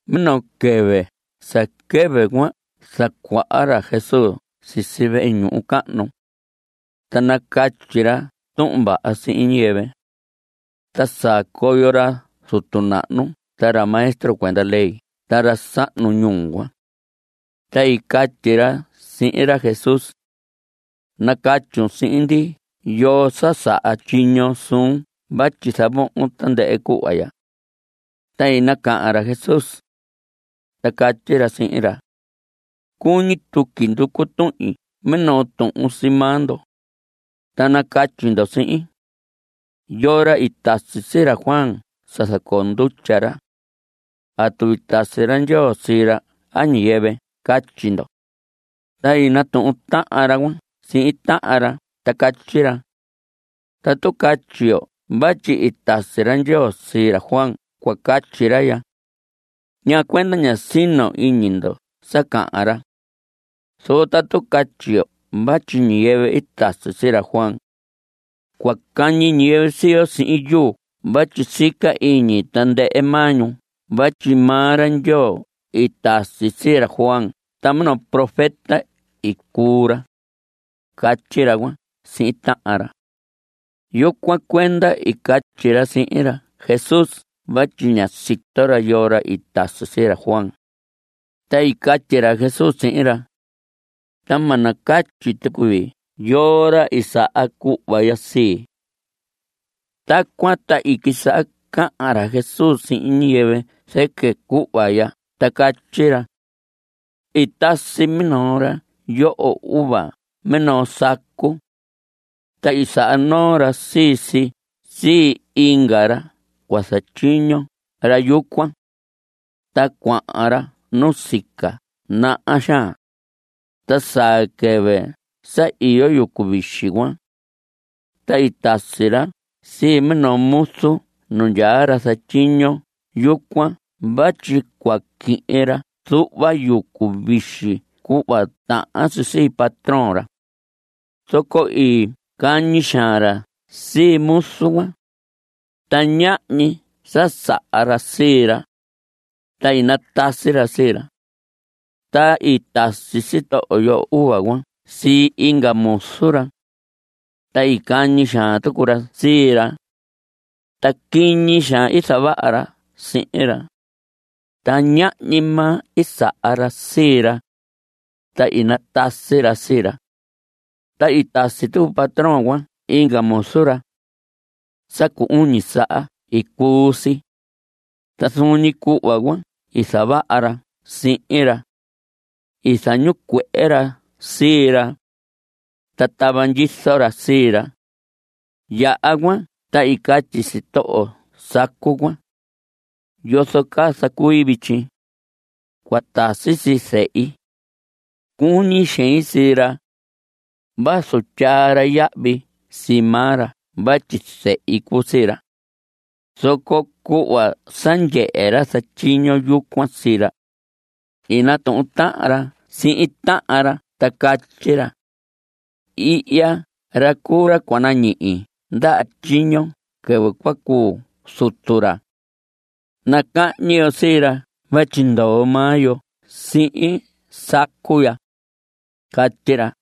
Minoo quɨvɨ sa quɨvɨ cuan zacuaha ra Jesús sisi vehe ñuhu cahnu, ta nacatyi ra tuhun vaha sihin ñiyɨvɨ. Ta saa coyo ra zutu nahnu ta ra maestro cuenda ley ta ra sahnu ñuu cuan. Ta i catyi ra sihin ra Jesús: Nacatyun sihin ndi ¿yoo sa saha tyiño suun vatyi zavohon tandɨhɨ cuhva ya? Ta i nacahan ra Jesús, ta catyi ra sihin ra: Cuñi tuqui nducu tuhin minoo tuhun sii maa ndo, ta nacatyi ndo sihin. ¿Yoo ra i tasi sii ra Juan sa zacoo ndutya ra? ¿Atu i tasi ra Ndyoo sii ra a ñiyɨvɨ? Catyi ndo. Ta i natuhun tahan ra cuan sihin tahan ra ta catyi ra: Tatu catyi yo vatyi i tasi ra Ndyoo sii ra Juan cua catyi ra ya: “¿Ñaa cuenda ñá sino iñi ndo sa cahan ra?” Zoco tatu catyi yo vatyi ñiyɨvɨ i tasi sii ra Juan, cua cahñi ñiyɨvɨ sii yo sihin yuu vatyi sica iñi tandɨhɨ maa ñu vatyi maa ra Ndyoo i tasi sii ra Juan ta minoo profeta i cuu ra. Catyi ra cuan sihin tahan ra. Yucuan cuenda i catyi ra sihin ra Jesús vatyi ña sito ra yoo ra i tasi sii ra Juan. Ta i catyi ra Jesús sihin ra: Ta ma nacatyi tucu vii yoo ra i saha cuhva ya sii. Tacuan ta i quisaha cahan ra Jesús sihin ñiyɨvɨ zɨquɨ cuhva ya ta catyi ra: I tasi minoo ra yoho uva minoo sacu. Ta i saha noo ra sii si sii inga ra cua zatyiño ra yucuan, ta cuahan ra nusica naha xaan. Ta saa quɨvɨ sa iyo yucu vixi cuan, ta i tasi ra sii minoo muzu nu ndyaa ra zatyiño yucuan vatyi cua quihin ra zuhva yucu vixi cuhva tahan si sii patrón ra. Zoco i cañi xaan ra sii muzu cuan. Ta ñahñi sa saha ra sii ra. Ta i natasi ra sii ra. Ta i tasi sitoho yoho uva cuan sii inga muzu ra, ta i cañi xaan tucu ra sii ra. Ta quiñi xaan i zavaha ra sihin ra. Ta ñahñi maa i saha ra sii ra, ta i natasi ra sii ra. Ta i tasi tucu patrón cuan inga muzu ra, sa cu uñi saha i cuu si. Ta zuun ñi cuhva cuan i zavaha ra sihin ra. I zañicuehe ra sii ra, ta tava ndyizo ra sii ra. Yaha cuan, ta i catyi sitoho sacu cuan: “¿Yozo caa zacui vityi? Cua tasi sii zehi. Cuñi xein sii ra, vazu tyaa ra yahvi sii maa ra vatyi zehi cuu sii ra.” Zoco cuhva sa ndyehe ra zatyiño yucuan sii ra, i natuhun tahan ra sihin tahan ra ta catyi ra: “Ihya ra cuu ra cua nañihi ndaha tyiño quɨvɨ cua cuu zutu ra. Nacahñi yo sii ra vatyi ndoo maa yo sihin sacu ya.” Catyi ra.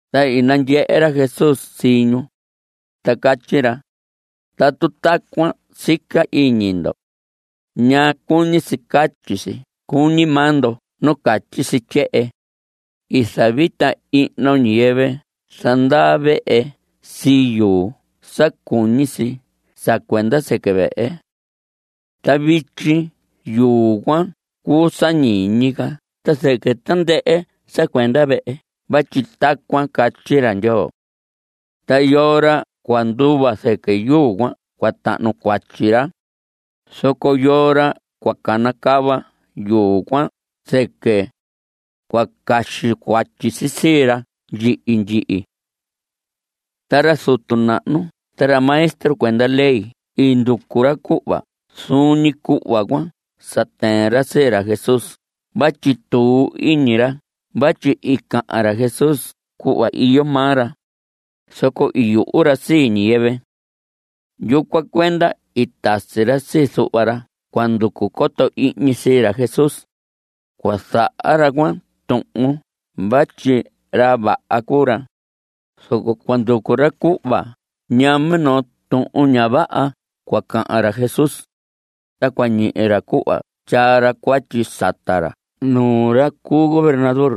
Ta i nandyehe ra Jesús sii ñu, ta catyi ra: Tatu tacuan sica iñi ndo ¿ñaa cuñi si catyi si cuñi maa ndo nu catyi si tyehen? “I zavita ihno ñiyɨvɨ zandaa vehe sii yuu sa cuñi si sa cuenda sɨquɨ vehe. Ta vityi yuu cuan cuu sa ñiñi ca ta zɨquɨ tandɨhɨ sa cuenda vehe cuan vatyi tacuan catyi ra Ndyoo. Ta yoo ra cua nduva zɨquɨ yuu cuan cua tahnu cuatyi ra, zoco yoo ra cua canacava yuu cuan zɨquɨ, cua caxi cuatyi si sii ra ndyihi ndyihi.” Ta ra zutu nahnu ta ra maestro cuenda ley i nducu ra cuhva zuun ñi cuhva cuan sa tɨɨn ra sii ra Jesús vatyi tuu iñi ra vatyi i cahan ra Jesús cuhva iyo maa ra. Zoco i yuhu ra sii ñiyɨvɨ. Yucuan cuenda i tasi ra sii zuhva ra cua nducu coto ihñi sii ra Jesús. Cua zaha ra cuan tuhun vatyi ra vaha cuu ra, zoco cua nducu ra cuhva ñaa minoo tuhun ña vaha cua cahan ra Jesús, ta cua ñihi ra cuhva tyaa ra cuatyi sata ra nuu ra cu gobernador.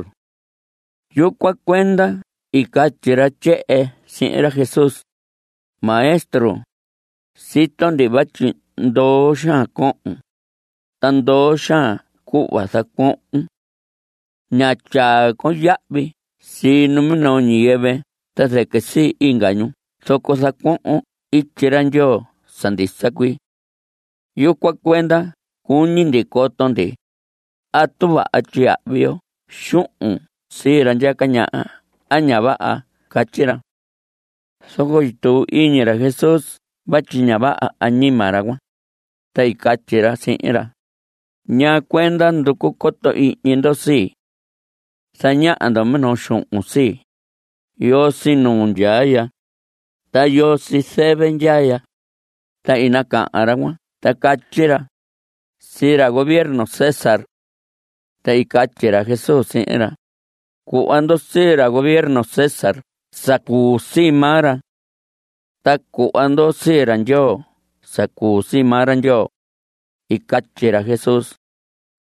Yucuan cuenda i catyi ra tyehen sihin ra Jesús: Maestro, sito ndi vatyi ndoo xaan cohon, ta ndoo xaan cuhva zacuohon. Ña tyaa con yahvi sii minoo ñiyɨvɨ ta zɨquɨ sii inga ñu zoco zacuohon ityi ra Ndyoo sa ndisa cuii. Yucuan cuenda cuñi ndi coto ndi: ¿Atu vaha tyiyahvi yo xuhun sii ra ndyaca ñaha a ña vaha? Catyi ra. Zoco i tuu iñi ra Jesús vatyi ña vaha añima ra cuan, ta i catyi ra sihin ra: ¿Ñaa cuenda nducu coto ihñi ndo sii? Zañaha ndo minoo xuhun sii. ¿Yoo sii nuu ndyaa ya? ¿Ta yoo sii zɨvɨ ndyaa ya? Ta i nacahan ra cuan ta catyi ra: Sii ra gobierno César. Ta i catyi ra Jesús sihin ra: Cuhva ndo sii ra gobierno César sa cuu sii maa ra. Ta cuhva ndo sii ra Ndyoo sa cuu sii maa ra Ndyoo. I catyi ra Jesús.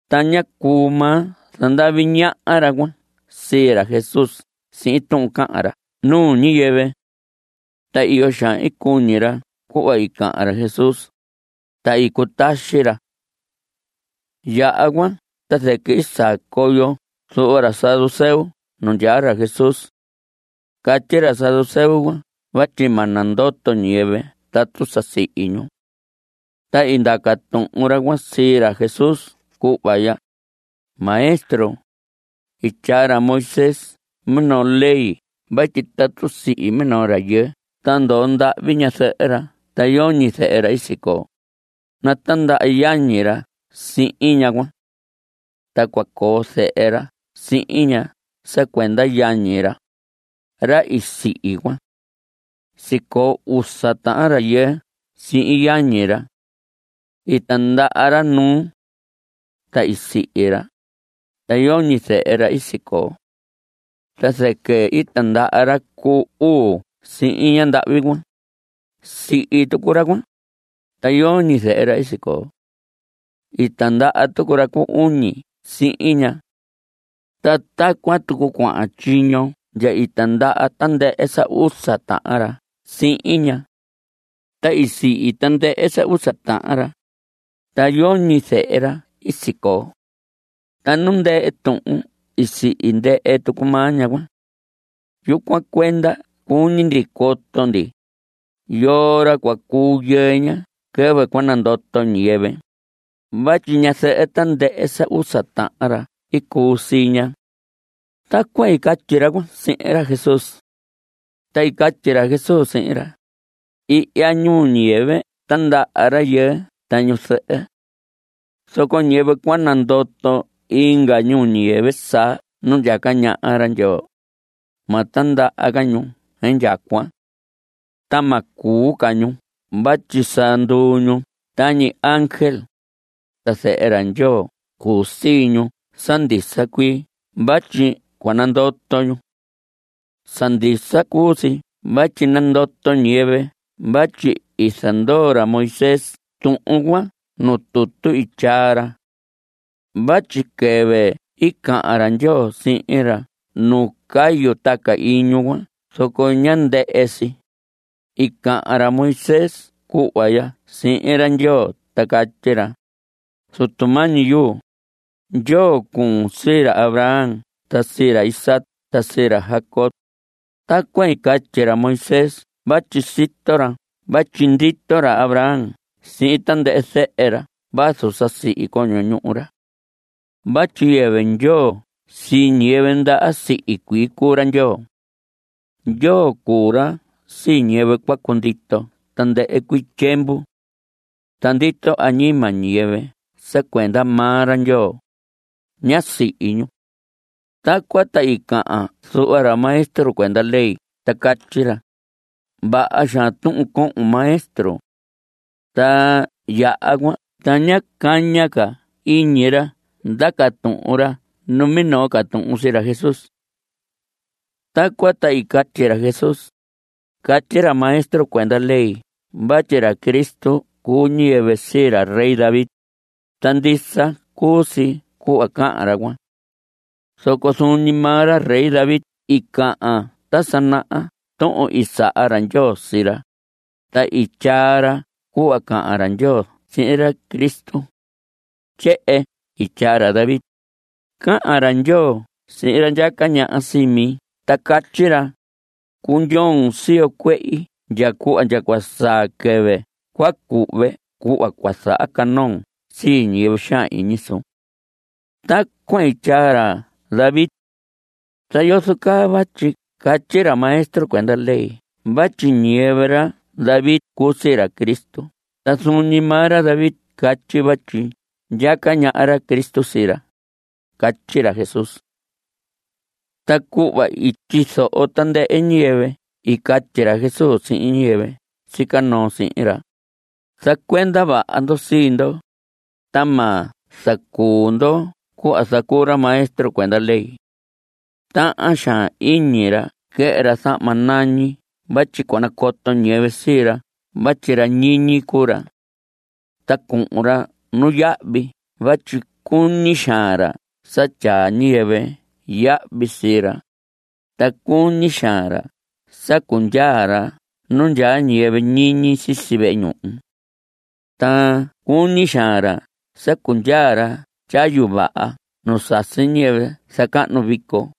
Ta ñá cuu maa zandavi ñaha ra cuan sii ra Jesús sihin tuhun cahan ra nuu ñiyɨvɨ. Ta iyo xaan i cuñi ra cuhva i cahan ra Jesús, ta i cutaxi ra. Yaha cuan ta zɨquɨ i saa coyo zuhva ra saduceo nu ndyaa ra Jesús. Catyi ra saduceo cuan vatyi ma nandoto ñiyɨvɨ tatu sa sihi ñu. Ta i ndaca tuhun ra cuan sii ra Jesús cuhva ya: Maestro, i tyaa ra Moisés minoo ley vatyi tatu sihi minoo rayɨɨ ta ndoo ndahvi ñazɨhɨ ra ta yoñi zehe ra i sicoo, natindaha yañi ra sihin ñaha cuan. Ta cua coo zehe ra sihin ña sa cuenda yañi ra, ra i sihi cuan. Sicoo usa tahan rayɨɨ sihin yañi ra. I tindaha ra nuu. Ta i sihi ra, ta yoñi zehe ra i sicoo. Ta zɨquɨ i tindaha ra cu uu sihin ñandahvi cuan. Sihi tucu ra cuan. Ta yoñi zehe ra i sicoo. I tindaha tucu ra cu uñi sihin ña. Ta tacuan tucu cuahan tyiño ndya i tindaha tandɨhɨ sa usa tahan ra sihin ña. Ta i sihi tandɨhɨ sa usa tahan ra, ta yoñi zehe ra i sicoo. Ta nu ndɨhɨ tuhun i sihi ndɨhɨ tucu maa ñaha cuan. Yucuan cuenda cuñi ndi coto ndi ¿yoo ra cua cuu yɨɨ ña quɨvɨ cua nandoto ñiyɨvɨ? vatyi ñazɨhɨ tandɨhɨ sa usa tahan ra i cuu sii ña. Tacuan i catyi ra cuan sihin ra Jesús. Ta i catyi ra Jesús sihin ra: Ihya ñuu ñiyɨvɨ tindaha rayɨɨ ta ñu zɨhɨ. Zoco ñiyɨvɨ cua nandoto inga ñuu ñiyɨvɨ saa nu ndyaca ñaha ra Ndyoo, ma tindaha ca ñu indyacuan. Ta ma cuu ca ñu vatyi sa nduu ñu tañi ángel. Ta zehe ra Ndyoo cuu sii ñu sa ndisa cuii vatyi cua nandoto ñu. Sa ndisa cuu si vatyi nandoto ñiyɨvɨ vatyi i zandoo ra Moisés tuhun cuan nu tutu i tyaa ra. Vatyi quɨvɨ i cahan ra Ndyoo sihin ra nu cayu taca iñu cuan zoco ñá ndɨhɨ si, i cahan ra Moisés cuhva ya sihin ra Ndyoo ta catyi ra: “Zutu mañi yuu, Ndyoo cuun sii ra Abraham ta sii ra Isaac ta sii ra Jacob.” (Tacuan i catyi ra Moisés vatyi sito ra vatyi ndito ra Abraham sihin tandɨhɨ zehe ra vazu sa sihi coño ñuhu ra.) Vatyi yɨvɨ Ndyoo sii ñiyɨvɨ ndaha sihi cuii cuu ra Ndyoo. Ndyoo cuu ra sii ñiyɨvɨ cua cundito tandɨhɨ cuii tyiemvu. Ta ndito añima ñiyɨvɨ sa cuenda maa ra Ndyoo. Ña sihi ñu. Tacuan ta i cahan zuhva ra maestro cuenda ley ta catyi ra: Vaha xaan tuhun cohon, Maestro. Ta yaha cuan ta ñá caña ca iñi ra ndaca tuhun ra numinoo ca tuhun sii ra Jesús. Tacuan ta i catyi ra Jesús: Catyi ra maestro cuenda ley vatyi ra Cristo cuu ñiyɨvɨ sii ra rey David, ta ndisa cuu si cuhva cahan ra cuan. Zoco zuun ñi maa ra rey David i cahan ta sa naha tuhun i saha ra Ndyoo sii ra, ta i tyaa ra cuhva cahan ra Ndyoo sihin ra Cristo. Tyehen i tyaa ra David: Cahan ra Ndyoo sihin ra ndyaca ñaha sii mi ta catyi ra: “Cundyoon siyo cuehi ndya cuhva ndya cua saa quɨvɨ cua cuhve cuhva cua zahacanoon sii ñiyɨvɨ xaan iñi suun.” Tacuan i tyaa ra David. ¿Ta yozo caa vatyi catyi ra maestro cuenda ley vatyi ñiyɨvɨ ra David cuu sii ra Cristo ta zuun ñi maa ra David catyi vatyi ndyaca ñaha ra Cristo sii ra? Catyi ra Jesús. Ta cuhva i tyizoho tandɨhɨ ñiyɨvɨ i catyi ra Jesús sihin ñiyɨvɨ sica noo sihin ra: Zacuenda vaha ndo sii ndo, ta ma zacuu ndo cuhva zacuu ra maestro cuenda ley. Tahan xaan iñi ra quɨhɨ ra zahma nañi vatyi cua nacoto ñiyɨvɨ sii ra vatyi ra ñiñi cuu ra. Ta cuhun ra nuyahvi vatyi cuñi xaan ra sa tyaa ñiyɨvɨ yahvi sii ra. Ta cuñi xaan ra sa cundyaa ra nu ndyaa ñiyɨvɨ ñiñi sisi vehe ñuhu. Ta cuñi xaan ra sa cundyaa ra tyayu vaha nu sasi ñiyɨvɨ zacahnu vico.